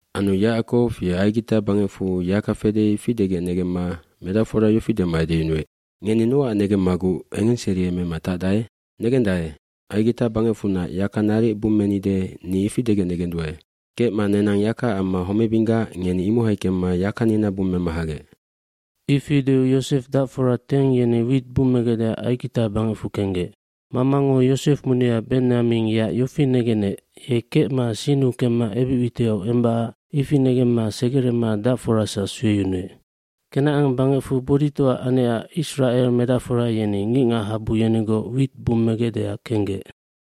aAnu Yacakow ye Aigita bangecfu yaka fede ifi degec negemma medacfora yofi dema edeyunuec, “Ngeni nocac negemmaguc engengseriemema tacdae? bNegendae, Aigita bangecfunac yaka naric bummenide ni ifi degec negenduae. Kecma nenang yakaac amma homebinggac ngeni imohai kemma yakanina bummema hagec.” Ifi deu Yosef dacfora teng yeni wit bummegecdeac Aigita bangecfu kenggec. Mamango Yosef munia Benyamin yeac yofi negenec ye kecma sinnu kemma ebic witiau embacac Ifi negemma segerema dacforasac sueyunuec. Kenacan bangecfu boditoa anecac Isracel medacfora yeni ngicngachabu yenigoc wit bummegecdeac kenggec.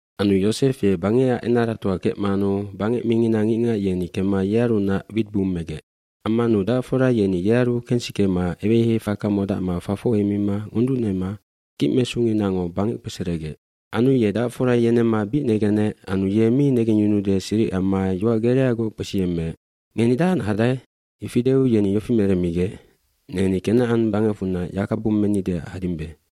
cAnu Yosef ye bangecac enaratoa kecmanu bangec mingina ngicngac yeni kemma yearunac wit bummegec. Ammanu dacfora yeni yearu kensikema eweheiheifaka modacma fafoc heimima ngonducnema kicmesunginango bangec kpeseregec. Anu ye dacfora yenemma bic negenec anu ye mi negengyunude siric amma yoac gereagoc kpesiyemmeec, “Ngeni dahacnac hadae?” Ifi deu yeni yofi meremmigec, “Neni Kenacan bangecfunac yaka bummenideac hadimbe.”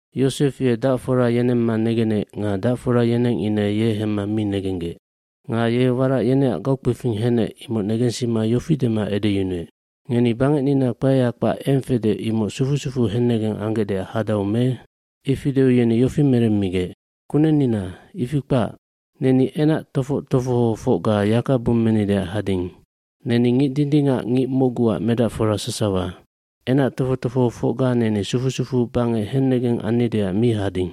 Yosef ye dacfora yenemma negenec nga dacfora yeneng ine ye hemma mi negenggec. dNga ye warac yeneac gaukpefing henec imoc negensima yofi dema edeyunuec, “Ngeni bangecnina kpaeya kpac eng fede imoc sufu sufuu hennegeng anggecdeac hadau me?” Ifi deu yeni yofi meremmigec, “Kunennina, ifi kpac, neni enac tofoc tofohofocga yaka bummenideac hading. Neni ngic dindingac ngic mocguac medacfora sasawa. Enac tofoc tofohofocga neni sufu sufuu bangec hennegeng annideac mi hading.”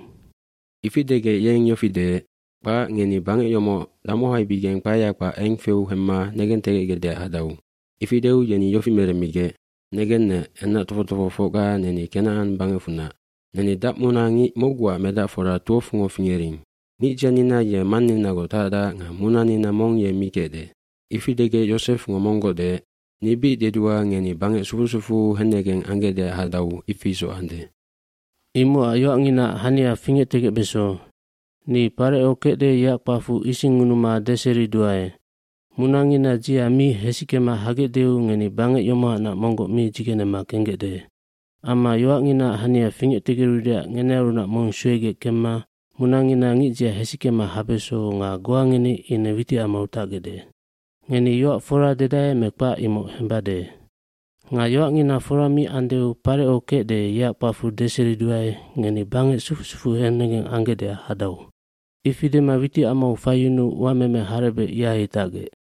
Ifi degec yeng yofi deec, “Kpac, ngeni bangec yomoc damohaibigeng kpaeya kpac eng feu hemma negentegecgecdeac hadau.” Ifi deu yeni yofi meremmigec, “Negennec, enac tofoc tofohofocga neni Kenacan bangecfunac. Neni dacmuna ngic mocguac medacfora 12ngo fingering. Ngicdzianina ye manninagoc tacdac nga munanina mong ye mi kecde.” Ifi degec Yosefngo monggoc deec, “Ni bic dedua ngeni bangec sufu sufuu hennegeng anggecdeac hadau ifi isoc ande. Imocac yoacnginaac hania fingectegecbeso. Ni Pareco kecde yeac kpacfu isingngunuma deseriduae, Munangina dzia mi hesickema hagecdeu ngeni bangec yomohanac monggoc mi dzigenema kenggecde. Amma yoacnginaac hania fingectegerudeac ngenearunac mong suegec kemma munangina ngicdzia hesickema habeso nga goa ngeni ine witicamau tacgecde. Ngeni yoac fora dedae me kpac imoc hembade. Nga yoacngina fora mi andeu Pareco kecde yeac kpacfu deseriduae ngeni bangec sufu sufuu hennegeng anggecdeac hadau.” Ifi dema witicamau faiyunuu uameme harebec ihai tacgec.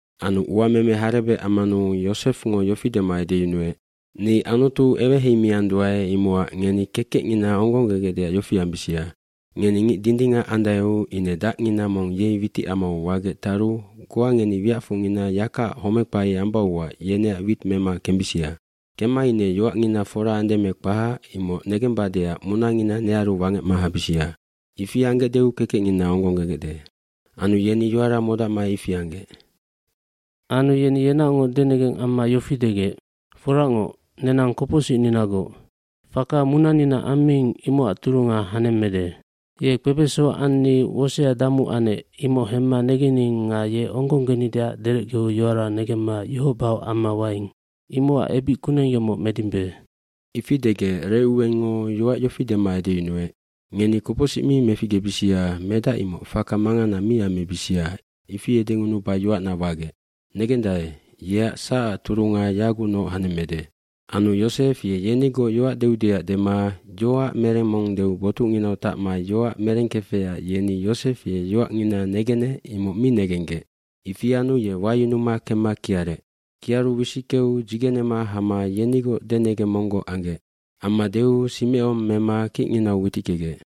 Anu uameme harebec ammanu Yosefngo yofi dema edeyunuec, “Ni Anutu eweheimianduae imocac ngeni kekecngina onggonggegecdeac yofi ambisia. Ngeni ngic dindingac andaeu ine dacngina mong yei witicamau wagec taru goa ngeni wiacfocngina yakaac homeckpai ambauac yeneac wit mema kembisia. Kemma ine yoacngina fora ande me kpahac, imoc negembadeac munangina nearu wangecma habisia. Ifi anggecdeu kekecngina onggonggegecde.” Anu yeni yoara modacma ifi anggec. Anu yeni yenaocngoc denegeng amma yofi degec, “Foracngoc, nenang kopocsicninagoc. Faka munanina ammiing imocac turunga hanemmede. Ye kpebeso anni wosea damu anec imoc hemma negening nga ye onggonggenideac derecgeu yoara negemma ioc baoc amma waing. Imocac ebic kuneng yomoc medimbe.” eIfi degec Recuwengngo yoac yofi dema edeyunuec, “Ngeni kopocsic mi meficgebisia medac imoc faka mangana mi ammibisia ifi edengunuba yoacna wagec. Negendae, yeac sacac turunga yagucnoc hanemmede.” Anu Yosef ye yenigoc yoac deudeac dema yoac mereng mong deu botucnginau tacma yoac merengkefecac yeni Yosef ye yoacngina negenec imoc mi negenggec. Ifi anu ye wayunuma kemma kiarec. Kiaru wisickeu dzigenema hama yenigoc denengeng monggoc anggec. Amma deu Simecon mema kicnginau witickegec.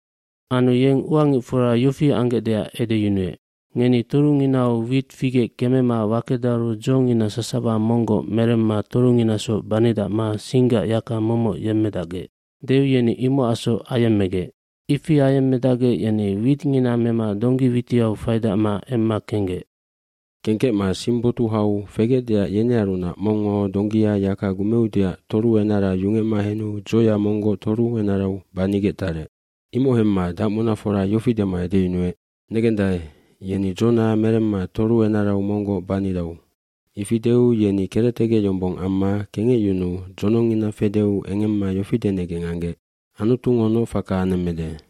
Anu yeng uangicfora yofi anggecdeac edeyunuec, “Ngeni torunginau wit figec kemema wakedaru dzongina sasawa monggoc meremma torunginasoc banidacma singgac yaka momoc yemmedacgec.” Deu yeni imocacsoc ayemmegec. Ifi ayemmedacgec yeni witngina mema donggi witiau faidacma emma kenggec. Kengkecma sing botuhau fegecdeac yenearunac mongngo donggia yaka gumeudeac toru enara yungecma henu dzoya monggoc toru enarau banigec tarec. Imoc hemma dacmunafora yofi dema edeyunuec, “Negendae, yeni dzona meremma toru enarau monggoc baridau.” Ifi deu yeni kerectegec yombong amma kengecyunuu dzonongngina fedeu engemma yofi denegeng anggec, “Anutungo noc faka anemmede.”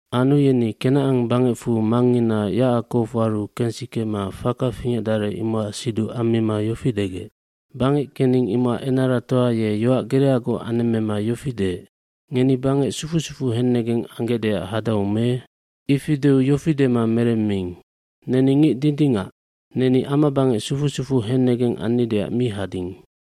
Anu yeni Kenacan bangecfu mangngina Yacakowaru kengsikema faka fingecdarec imocac siduc ammima yofi degec, “Bangec kening imocac enaratoa ye yoac gereagoc anemmema yofi deec, ‘Ngeni bangec sufu sufuu hennegeng anggecdeac hadau me?’ Ifi deu yofi dema meremmiing, ‘Neni ngic dindingac. Neni ama bangec sufu sufuu hennegeng annideac mi hading.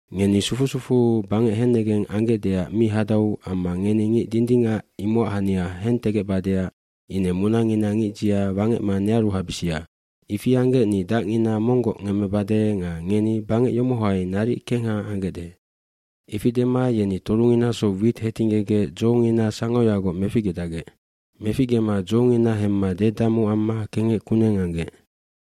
Ngeni sufu sufuu bangec hennegeng anggecdeac mi hadau amma ngeni ngic dindingac imocac hania hentegecbadeac ine munangina ngicdzia wangecma nearu habisia. Ifi anggec ni dacngina monggoc ngemmebade nga ngeni bangec yomohai naric kengha anggecde.’” Ifi dema yeni torunginasoc wit hetinggegec dzongina sangoyagoc meficgedacgec. Meficgema dzongina hemma dedamu amma kengec kuneng anggec.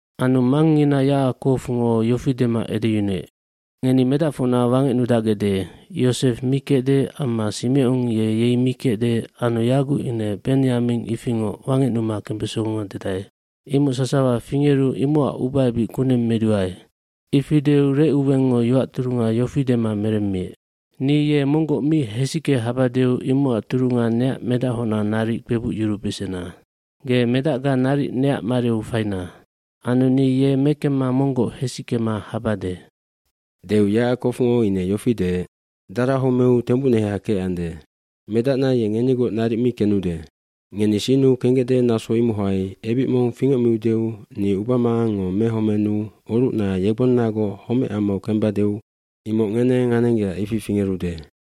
Anu mangngina Yacakowngo yofi dema edeyunuec, “Ngeni medacfocna wangecnudacgecde, Yosef mi kecde amma Simecon ye yei mi kecde anu yaguc ine Benyamin ifingoc wangecnuma kembesonga dedae. Imoc sasawa fingeru imocac ubaebic kuneng meduae.” Ifi deu Recuwengngo yoac turunga yofi dema meremmiec, “Ni ye monggoc mi hesicke habadeu imocac turunga neac medachocna naric kpebucyurubesena. Ge medacga naric neac mariu faina. Anu ni ye mekemma monggoc hesickema habade.” fDeu Yacakowngo ine yofi deec, “Dara homeu tembucneha kecande. Medacna ye ngenigoc naric mi kenude. Ngeni sinnu kenggecde naso imohai ebic mong fingecmiudeu ni ubamangangngo mehomenuu orucna yegbonnagoc homecamau kembadeu imoc ngeneng anenggecac ifi fingerude.”